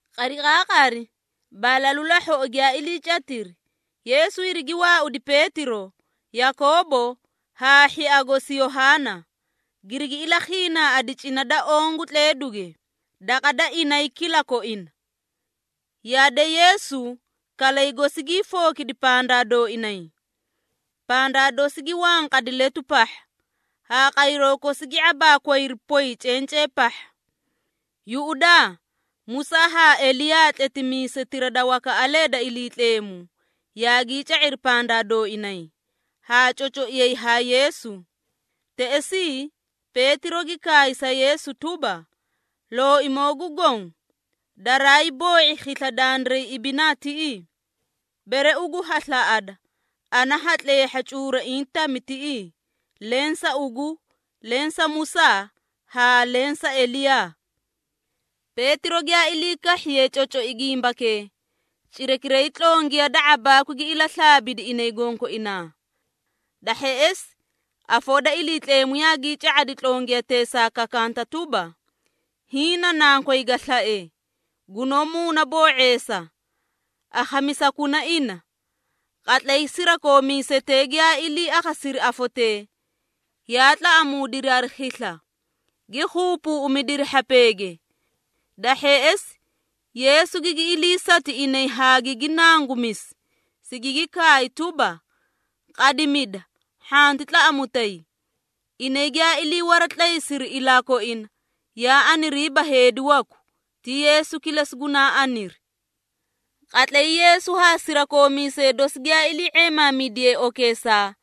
Qariqaaqari balalu lahhoꞌo giyaa iliicatiri, Yeesu hirigi waaudi Peetiro, Yakoobo haa hhia gosi Yohaana, girigi ilakhiinaaꞌadi cina da oõ gu tleeduge, daqa da inay kilakoina. Yade, Yeesu kalay gosi gii fookidi pandaa dooinay. Pandaa dosi gi wanqadi letu pahha, haa qayroo kosi gi ⁄abaakwayri poy cencee pahha. Yuꞌudaa, Musaa haa Eliyaa tletimiisetira da wakaꞌalee da Iliitleemu, yaagii ca⁄iri pandaa dooinay, haa cocoiyay haa Yeesu. Teꞌesii, Peetiro gi kaay sa Yeesu tuba, “Looimoo gu Goõ, daraay boo⁄i khisla dandiray ibinaa tiꞌii. Bere ugu ha slaꞌada, ana ha tleehha cuuraiĩ tami tiꞌii, leẽ sa ugu, leẽ sa Musaa haa leẽ sa Eliyaa.” Peetiro giyaa ilii kahhiye cocoi gimbakee, cirakiray tlongiya da ⁄abaakwi gi ilaslaabidi inay gonkoinaa. Da hheꞌesi, afoo da Iliitleemu yaagii ca⁄adi tlongiyateesaa kakanta tuba, “Hiĩ na Nankoy ga slae, gunoó muunaboo⁄eesa, akhamisakuna ina.” Qatlay sirakoomiisetee giyaa ilii akhasiri afotee, yaa tlaꞌamuudiri hari khisla, gi khuupuꞌumidiri hhapeege. Da hheꞌesi, Yeesu gigi iliisati inay haa gigi nangumisi, sigigi kaay tuba, “Qadimida, hhanti tlaꞌamutay.” Inay giyaa iliiwaratlaysiri ilaa koina, yaa aniriiba heedi waku, ti Yeesu kilesi gunaa aniri. Qatlay Yeesu haa sirakoomiisee dosi giyaa ilii⁄eemaamidiyee okeesaa,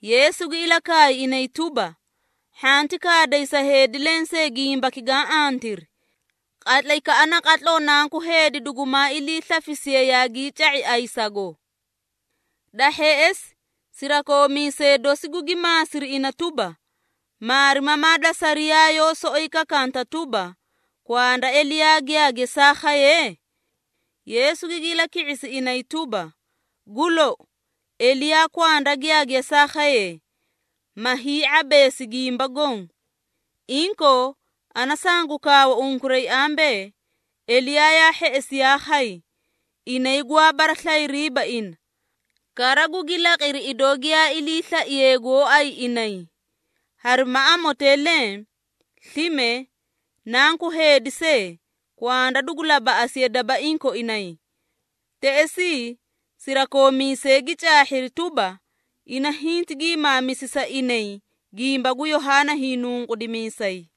Yeesu gi ilakaay inay tuba, “Hhanti kaaday sa heedi lensee gimbaki gaã antiri, qatlaykaꞌa naqatloo Nanku Heedi dugumaa iliislafisiye yaagii ca⁄i ayisago.” Da hheꞌesi, sirakoomiisee dosi gugi maasiri ina tuba, “Maarimamaa da sariyaa yoó soꞌoyi kakaanta tuba, kwanda Eliyaa giyaa gesaa khaye?” Yeesu gigi ilaki⁄isi inay tuba, “Gu lou, Eliyaa kwanda giyaa gesaa khaye, ma hii⁄abeesi gimba goõ. Inkoo, ana sangu kaawa unkuray ambee, Eliyaa yaa hheꞌesi yaa khay, inay gwaa baraslayiriiba ina, kara gugi laqiri idoo giyaa iliislaiyee gooay inay. Harima amotee leẽ, slime, Nanku Heedi see, kwanda dugu labaꞌasiye dabaiĩ koinay.” Teꞌesii, sirakoomiisee gi caahhiri tuba, ina hinti giimaamisi sa inay gimba gu Yohaana Hiinunqudimiisay.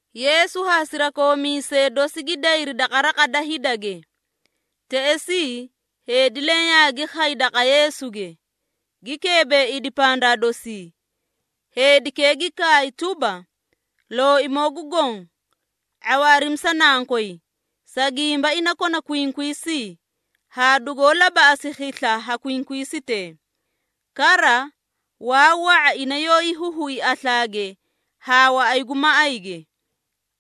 Yeesu haa sirakoomiisee dosi gi dayri daqa raqa da hidage. Teꞌesii, heedi leẽ yaagi khay daqa Yeesuge, gi keebeeidi pandaa dosii. Heedikee gi kaay tuba, “Looimoo gu Goõ, ⁄awaarimi sa nankoy, sa gimba ina kona kwinkwiisii, haa dugoó labaꞌasi khisla ha kwinkwiisitee. Kara, waa wa⁄a ina yoóyi huhui aslaage haa waꞌay gu maꞌayge.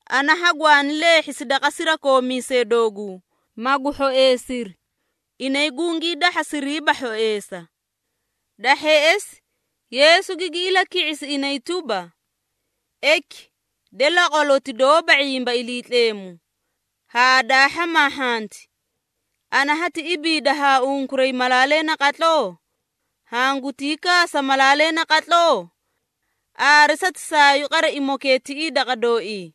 Ana hagwaani leehhisi daqa sirakoomiisee dooguu, magu hhoeesiri, inay gungii dahhasiriiba hhoeesa.” Da hheꞌesi, Yeesu gigi ilaki⁄isi inay tuba, “Eki, de laqwaloti doóba ⁄imba Iliitleemu, haa daa hhamaahhanti! Ana hati ibiida haa unkuray malaalee naqatloo? Hangutii kaasa malaalee naqatloo? Aare satisaayuu qaraimokee tiꞌii daqa dooii.”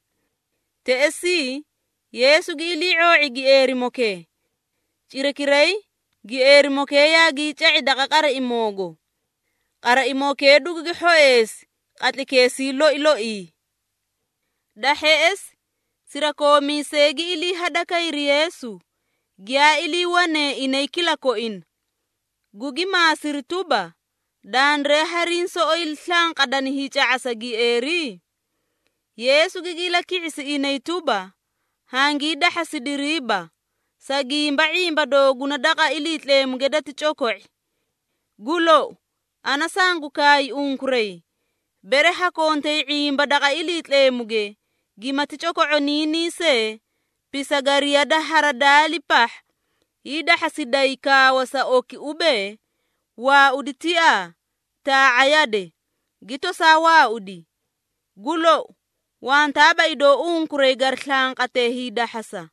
Teꞌesii, Yeesu gi ilii⁄oo⁄i gieerimokee. Cirakiray, gieerimokee yaagii ca⁄i daqa qaraimoogo. Qaraimokee dugugi hhoeesi qatlaykeesii loi loii. Da hheꞌesi, sirakoomiisee gi ilii hadakayri Yeesu, giyaa iliiwanee inay kilakoina, gugi maasiri tuba, “Dandiray hariĩ soꞌoyi slanqadani hiica⁄asa gieeri?” Yeesu gigi ilaki⁄isi inay tuba, “Hangii dahhasidiriiba, sa gimba ⁄imba dooguna daqa Iliitleemuge dati coko⁄i. Gu lou, ana sangu kaay unkuray, bere ha kontay ⁄imba daqa Iliitleemuge, gimati coko⁄oniinii see pisagariya da haradaali pahha, hiidahhasiday kaawa sa oki ubee, ‘Waaudi tiaa, taa⁄a yade,’ gi tosaa waaudi. Gu lou, wantaaba idoo unkuray gari slanqatee hiidahhasa.”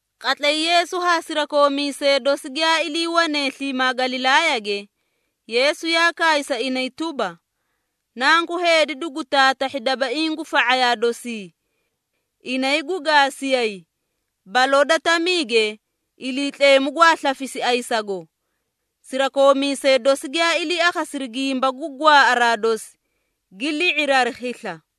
Qatlay Yeesu haa sirakoomiisee dosi giyaa iliiwanee sliimaa Galilaayage, Yeesu yaa kaay sa inay tuba, “Nanku Heedi dugu taatahhi dabaiĩ gu fa⁄ayaa dosii. Inay gu gaasiyay, baloo da tamiige Iliitleemu gwaa slafisi ayisago.” Sirakoomiisee dosi giyaa ilii akhasiri gimba gu gwaaꞌaraa dosi, gi li⁄iri hari khisla.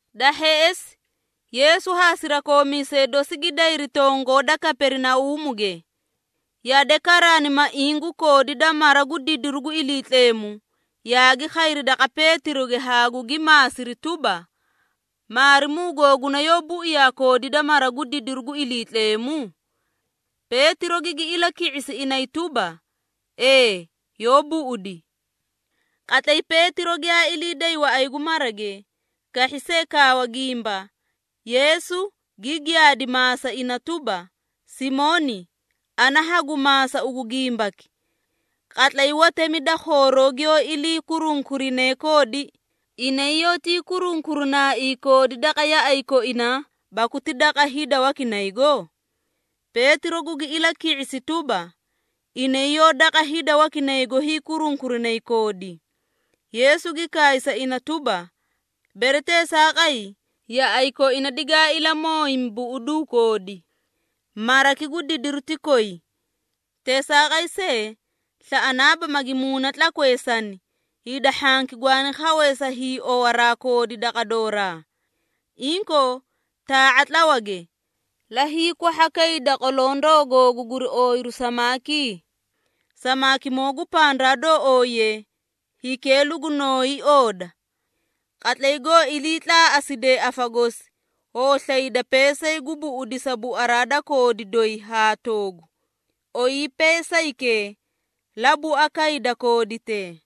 Da hheꞌesi, Yeesu haa sirakoomiisee dosi gi dayri tongoo da Kaperinauumuge. Yade, karaanimaiĩ gu koodi da mara gu didiru gu Iliitleemu, yaagi khayri daqa Peetiroge haa gugi maasiri tuba, “Maarimuu googuna yoó buiyaa koodi da mara gu didiru gu Iliitleemu?” Peetiro gigi ilaki⁄isi inay tuba, “Ee yoó buꞌudi.” Qatlay Peetiro giyaa ilii day waꞌay gu marage, kahhi see kaawa gimba, Yeesu gi giyaadi maasa ina tuba, “Simooni, ana hagu maasa ugu gimbaki. Qatlay watemi da khooroo giyoó ilii kurunkurinee koodi, inay yoótii kurunkurinaaii koodi daqa yaꞌay koinaa, baku ti daqa hida wakinaygo?” Peetiro gugi ilaki⁄isi tuba, “Inay yoó daqa hida wakinaygo hiikurunkurinay koodi.” Yeesu gi kaay sa ina tuba, “Bere teesaaqay, yaꞌay koina digaa ilamooyimi, buꞌuduu koodi. Maraki gu didiru ti koyi. Teesaaqay see, slaꞌanaaba magi muuna tlakweesani, hida hhanki gwaani khawee sa hiiowaraa koodi daqa dooraa. Inkoo, taa⁄a tlawage, la hiikwahhakayda qolondoo googu guri ooyiru samaakii. Samaakimoo gu pandaa doo ooyiye, hikee lugunooyi ooda. Qatlay goo iliitlaaꞌaside afa gosi, hoo slayda peesay gu buꞌudisa buaraa da koodi doyi haa toogu, ooyi peesaykee, la buakayda kooditee.”